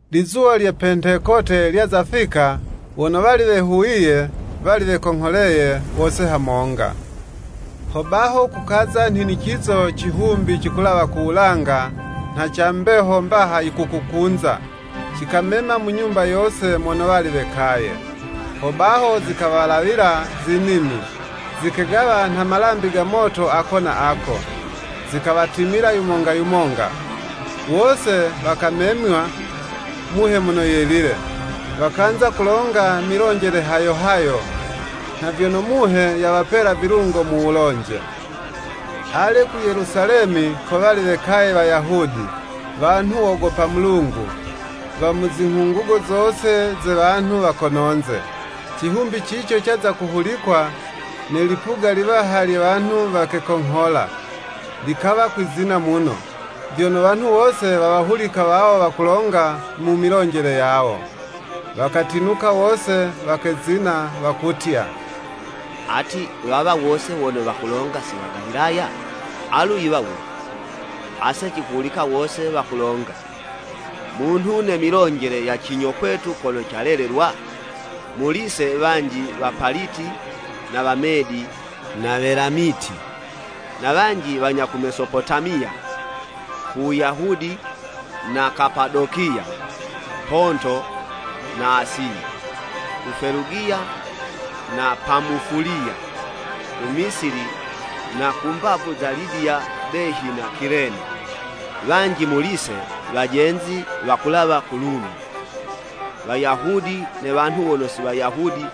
Lizuwa lye Pentekote lyaza fika, wono wali wehuwiye, wali wekongholeye wose hamonga. Hobaho kukaza nhinicizo cihumbi cikulawa ku wulanga nha ca mbeho mbaha yikukukunza, cikamema mu nyumba yose mono wali wekaye. Hobaho zikawalawila zinimi, zikegawa nha malambi go moto ako na ako, zikawatimila yumonga yumonga. Wose wakamemywa Muhe Mono Yelile, wakanza kulonga milonjele hayo hayo, nha vyono Muhe yawapela vilungo mu wulonje. Ale, ku Yelusalemi ko wali wekaye Wayahudi, wanhu wogopa Mulungu, wa mu zinghungugo zose ze wanhu wa kononze. Cihumbi cico caza kuhulikwa, ne lipuga liwaha lye wanhu wakekonghola, likawa kwizina muno, vyono wanhu wose wawahulika wawo wakulonga mu milonjele yawo. Wakatinuka wose, wakezina, wakutya, “Ati, wawa wose wono wakulonga si Wagalilaya? Alu yiwa wule, ase cikuwahulika wose wakulonga, munhu ne milonjele ya cinyo kwetu kono calelelwa? Muli'se, wanji Wapaliti na Wamedi na Welamiti, na wanji wanya ku Mesopotamiya, ku Wuyahudi, na Kapadokiya, Ponto, na Asiya, ku Felugiya na Pamufuliya, ku Misili na ku mbavu za Libiya behi na Kilene; wanji muli 'se wajenzi wakulawa ku Lumi, Wayahudi, ne wanhu wono si Wayahudi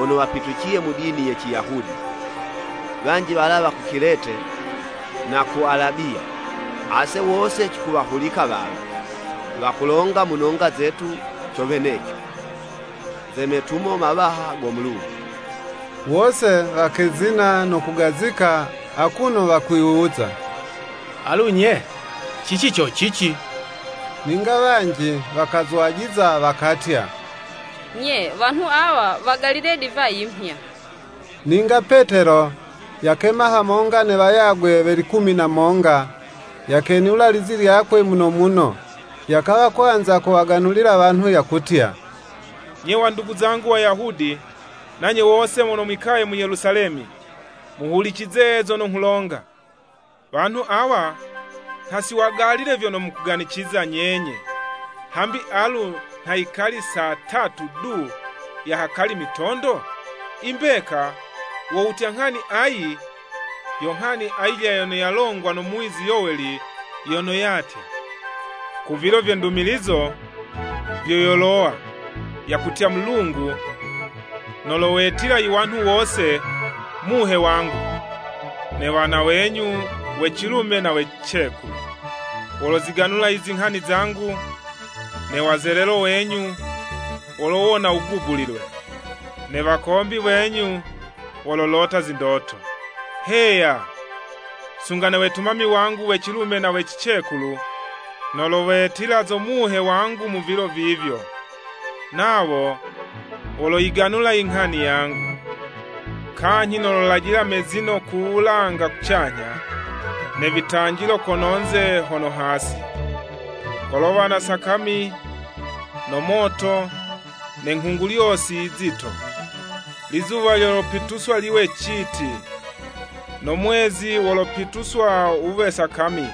wono wapituciye mu dini ye Ciyahudi, wanji walawa ku Kilete na ku Alabiya. Ase wose cikuwahulika wawa, wakulonga mu nonga zetu co weneco, ze metumo mawaha go Mulungu.” Wose wakezina no kugazika akuno wakwiwuza, “Alu nye, cici co cici?” Ninga wanji wakazwajiza wakatya, “Nye, wanhu awa wagalile divayi mhya.” Ninga Petelo, yakema hamonga ne wayagwe we likumi na monga, yakenula lizi lyakwe muno muno, yakawa kwanza kuwaganulila wanhu yakutya, “Nye wandugu zangu Wayahudi, nanye wose mono mwikaye mu Yelusalemi, muhulicize zono nghulonga. Wanhu awa nha si wagalile vyono mukuganiciza nyenye, hambi alu nha yikali saa tatu du ya hakali mitondo? I mbeka, wo wutya nghani ayi, yo nghani ayilya yono yalongwa no muwizi Yoweli yono yatya, ‘Ku vilo vye ndumilizo vyo yolowa, yakutya Mulungu, nolowetila iwanhu wose Muhe wangu. Ne wana wenyu, we cilume na we cicekulu woloziganula izinghani zangu, ne wazelelo wenyu, wolowona wugubulilwe, Ne wakombi wenyu, wololota zindoto. Heya, sunga ne wetumami wangu we cilume na we cicekulu, nolowetila zo Muhe wangu mu vilo vivyo, nawo woloyiganula inghani yangu. Kanyhi nololajila imezino ku wulanga kucanyha, ne vitanjilo kono'nze hono hasi, kolowa na sakami, no moto ne nghungulyosi yizito. Lizuwa lyolopituswa liwe citi, no mwezi wolopituswa wuwe sakami,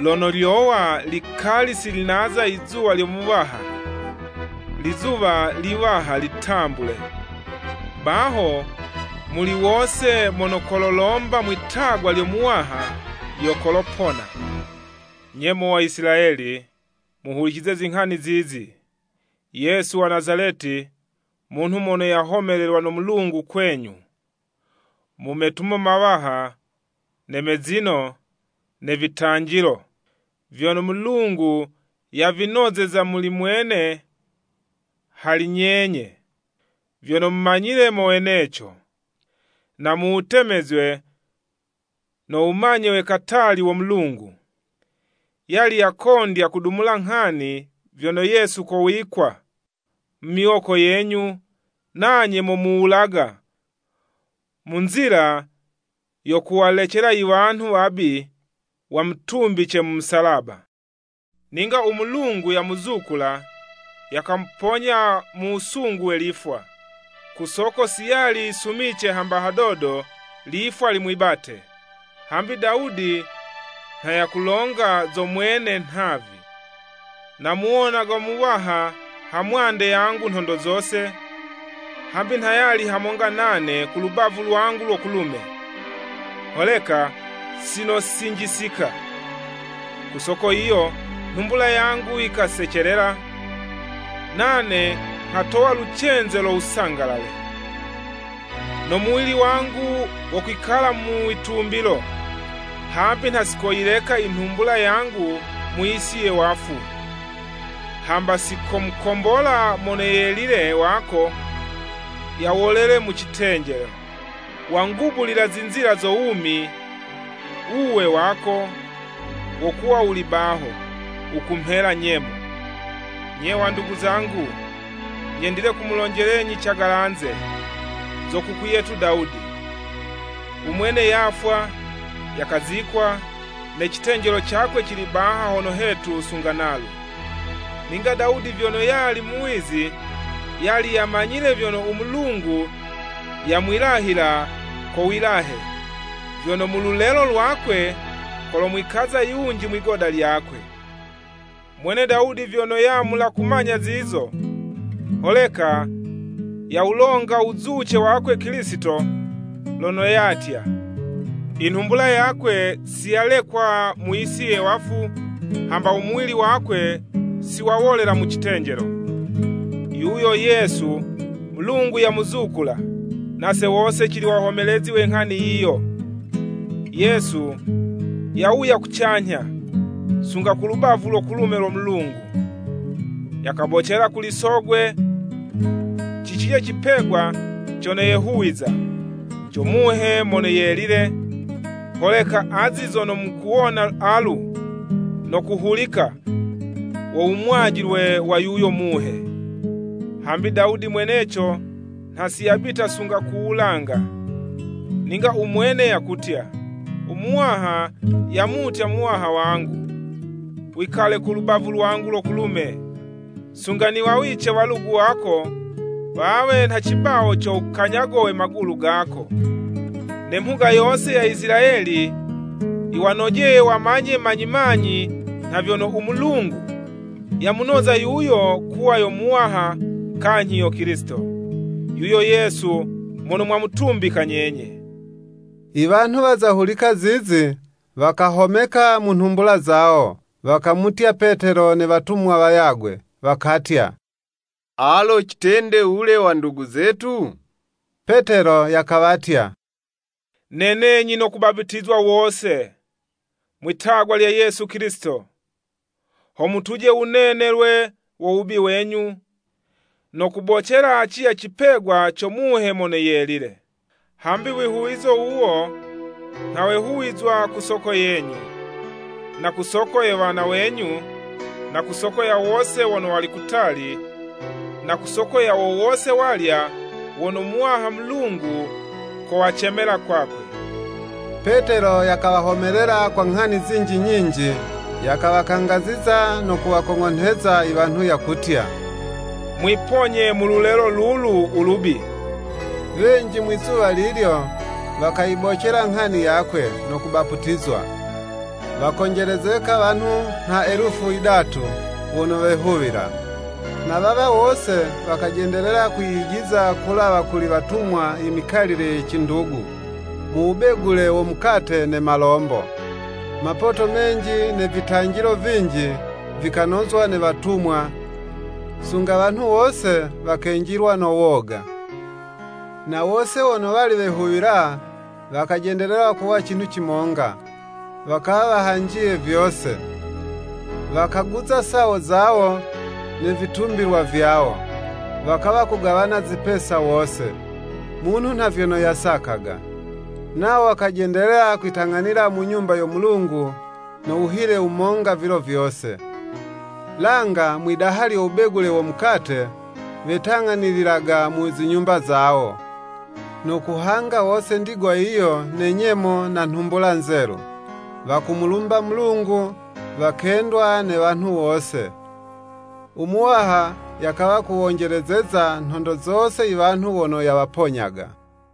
lono lyowa likali si naza ilizuwa lyo Muwaha, lizuwa liwaha litambule, Baho, muli wose mono kololomba mwitagwa lyo Muwaha yo kolopona.’ “Nye mo wa Isilayeli, muhulicize zinghani zizi! Yesu wa Nazaleti, munhu mono yahomelelwa no Mulungu kwenyu, mu metumo mawaha ne mezino, ne vitanjilo, vyono Mulungu yavinozeza muli mwene hali nyenye, vyono mumanyile mo weneco, na mu wutemezwe no wumanye we katali wo Mulungu, yali yakondya kudumula nghani, vyono Yesu kowikwa mu miwoko yenyu, nanye mukamuwulaga mu nzila yo kuwalecela iwanhu wabi, wamutumbice mu musalaba Ninga u Mulungu yamuzukula, yakamuponya mu wusungu we lifwa, ku soko si yali yisumice hamba hadodo lifwa limwibate. Hambi Dawudi nha yakulonga zo mwene nhavi, ‘Namuwonaga Muwaha ha mwande yangu nhondo zose, hambi nha yali hamonga nane ku lubavu lwangu lo kulume, holeka sinosinjisika. Ku soko yiyo nhumbula yangu yikasecelela, nane nghatowa lucenze lo wusangalale. No muwili wangu wokwikala mu witumbilo, Hambi nha si koyileka inhumbula yangu mu yisi ye wafu, hamba si komukombola Mono Yelile wako yawolele mu citenjelo. Wangubulila zinzila zo wumi, wuwe wako, wo kuwa wuli baho, wukumhela nyemo!’ “Nye wandugu zangu, nyendile kumulonjelenyi cagalanze, zo kuku yetu Dawudi. U mwene yafwa, yakazikwa, ne citenjelo cakwe cili baha hono hetu sunga nalu. Ninga Dawudi vyono yali muwizi, yali yamanyile vyono u Mulungu yamwilahila ko wilahe, vyono mu lulelo lwakwe, kolomwikaza yunji mwigoda lyakwe; mwene Dawudi vyono yamula kumanya zizo, holeka yawulonga wuzuce wakwe Kilisito, lono yatya, ‘Inhumbula yakwe si yalekwa mu yisi ye wafu, hamba u muwili wakwe si wawolela mu citenjelo.’ Yuyo Yesu, Mulungu yamuzukula, nase wose cili wahomelezi we nghani yiyo. Yesu yawuya kucanyha, sunga ku lubavu lo kulume lo Mulungu, yakabocela kuli Sogwe cicilya cipegwa cono yehuwiza, co Muhe Mono Yelile; holeka azi zono mukuwona alu, no kuhulika, wo wumwajilwe wa yuyo Muhe. Hambi Dawudi mweneco, nha si yabita sunga ku wulanga, ninga umwene yakutya: ‘U Muwaha yamutya Muwaha wangu, Wikale ku lubavu lwangu lo kulume, Sunga niwawice walugu wako wawe nha cibawo co wukanyago we magulu gako.’ “Ne mhuga yose ya Isilayeli yiwanojeye wamanye manyi manyi, nha vyono, u Mulungu yamunoza yuyo, kuwa yo Muwaha kanyhi yo Kilisito, yuyo Yesu mono mwamutumbika nyenye.” Iwanhu waza hulika zizi, wakahomeka mu nhumbula zawo, wakamutya Petelo ne watumwa wayagwe, wakatya, “Alo citende wule wandugu zetu.” Petelo yakawatya, “Nenenyi no kubaputizwa wose, mwitagwa lya Yesu Kilisito, ho mutuje wunenelwe wo wubi wenyu; no kubocela acilya icipegwa co Muhe Mono Yelile. Hambi wihuwizo wuwo nha wehuwizwa ku soko yenyu, na ku soko ye wana wenyu, na ku soko ya wose wono wali kutali, na kusoko ya wo wose walya wono Muwaha Mulungu kowacemela kwakwe.” Petelo yakawahomelela kwa nghani zinji nyinji; yakawakangaziza no kuwakong'onheza iwanhu yakutya, “Mwiponye mu lulelo lulu ulubi.” Wenji mwizuwa lilyo, wakayibocela nghani yakwe, no kubaputizwa. Wakonjelezeka wanhu nha elufu yidatu wono wehuwila. Na wawa wose wakajendelela kwiyijiza kulawa kuli watumwa imikalile ye cindugu, mu wubegule wo mukate ne malombo. Mapoto menji ne vitanjilo vinji vikanozwa ne watumwa, sunga wanhu wose wakenjilwa no woga. Na wose wono wali wehuwila wakajendelela kuwa cinhu cimonga, wakawa wahanjiye vyose; wakaguza sawo zawo, ne vitumbilwa vyawo, wakawa kugawana zipesa wose, munhu nha vyono yasakaga. Nawo wakajendelela kwitang'anila mu Nyumba yo Mulungu no wuhile wumonga vilo vyose. Langa mwi'daha lyo wubegule wo mukate, wetang'anililaga mu zinyumba zawo, no kuhanga wose ndigwa yiyo ne nyemo na nhumbula nzelu, wakumulumba Mulungu, wakendwa ne wanhu wose. U Muwaha yakawa kuwonjelezeza nhondo zose iwanhu wono yawaponyaga.